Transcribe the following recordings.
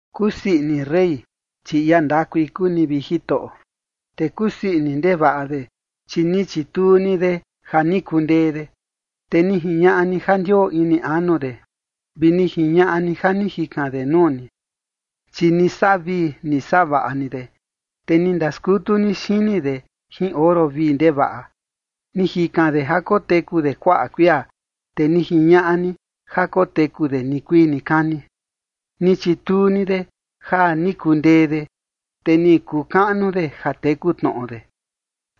Kusii ini rey, chi ia ndakui kuu ni, vi Jitoꞌo. Te kusii ini ndevaꞌa de, chi ni chituu ni de ja ni kundee de. Te ni jiñaꞌa ni ja ndioo ini anu de, vi ni jiñaꞌa ni ja ni jikan de nuu ni. Chi ni saꞌa vii ni saꞌa vaꞌa ni de, te ni ndaskutu ni xini de jin oro vii ndevaꞌa. Ni jikan de ja koteku de kuaꞌa kuia, te ni jiñaꞌa ni ja koteku de nikuii nikani. Ni chituu ni de ja ni kundee de, te ni kuu kaꞌnu de ja teku tnoꞌo de,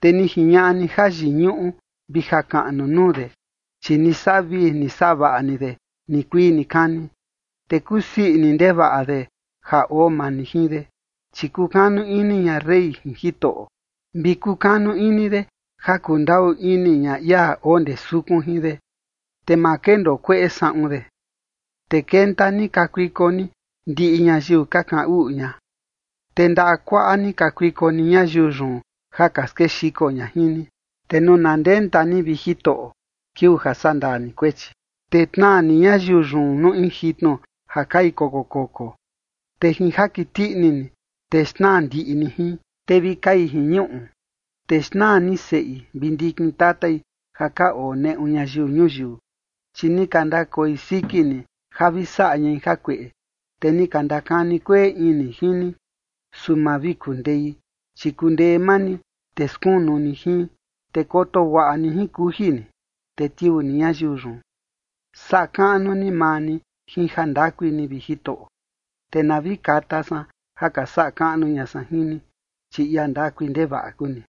te ni jiñaꞌa ni jayiñuꞌu vi jakaꞌnu nuu de. Chi ni saꞌa vii ni saꞌa vaꞌa ni de nikuii nikani, te kusii ini ndevaꞌa de ja oo maa ni jin de. Chi kukanu ini ña rey jin Jitoꞌo, vi kukanu ini de ja kundaꞌu ini ña ia oo ndee sukun jin de, te ma kendoo kueꞌe saꞌun de. Te kenta ni kakuiko ni ndiꞌi ñayiu ka kaꞌan uꞌu ña, te ndaꞌa kuaꞌa ni kakuiko ni ñayiu yun ja ka skexiko ña jin ni. Te nuu na ndenta ni, vi Jitoꞌo, kiuu ja sandaa ni kuechi, te tnaa ni ñayiu yun nuu in jitnu ja kai koko koko, te jin jakiti ini ni, te xnaa ndiꞌi ni jin, te vi kai jin ñuꞌu. Te xnaa ni seꞌi vi ndikin tatai ja ka oo neꞌu ñayiu ñuyiu. Chi ni ka ndakoi siki ni ja vi saꞌa ñai jakueꞌe, te ni ka ndakani kueꞌe ini jin ni, su ma vi kundei. Chi kundee maa ni, te skunu ni jin, te koto guaꞌa ni jin kuji ni, te tiuu ni ñayiu yun. Saꞌa kaꞌnu ni maa ni jin jandakui ni, vi Jitoꞌo, te na vi kata san ja ka saꞌa kaꞌnu ña san jin ni, chi ia ndakui ndevaꞌa kuu ni.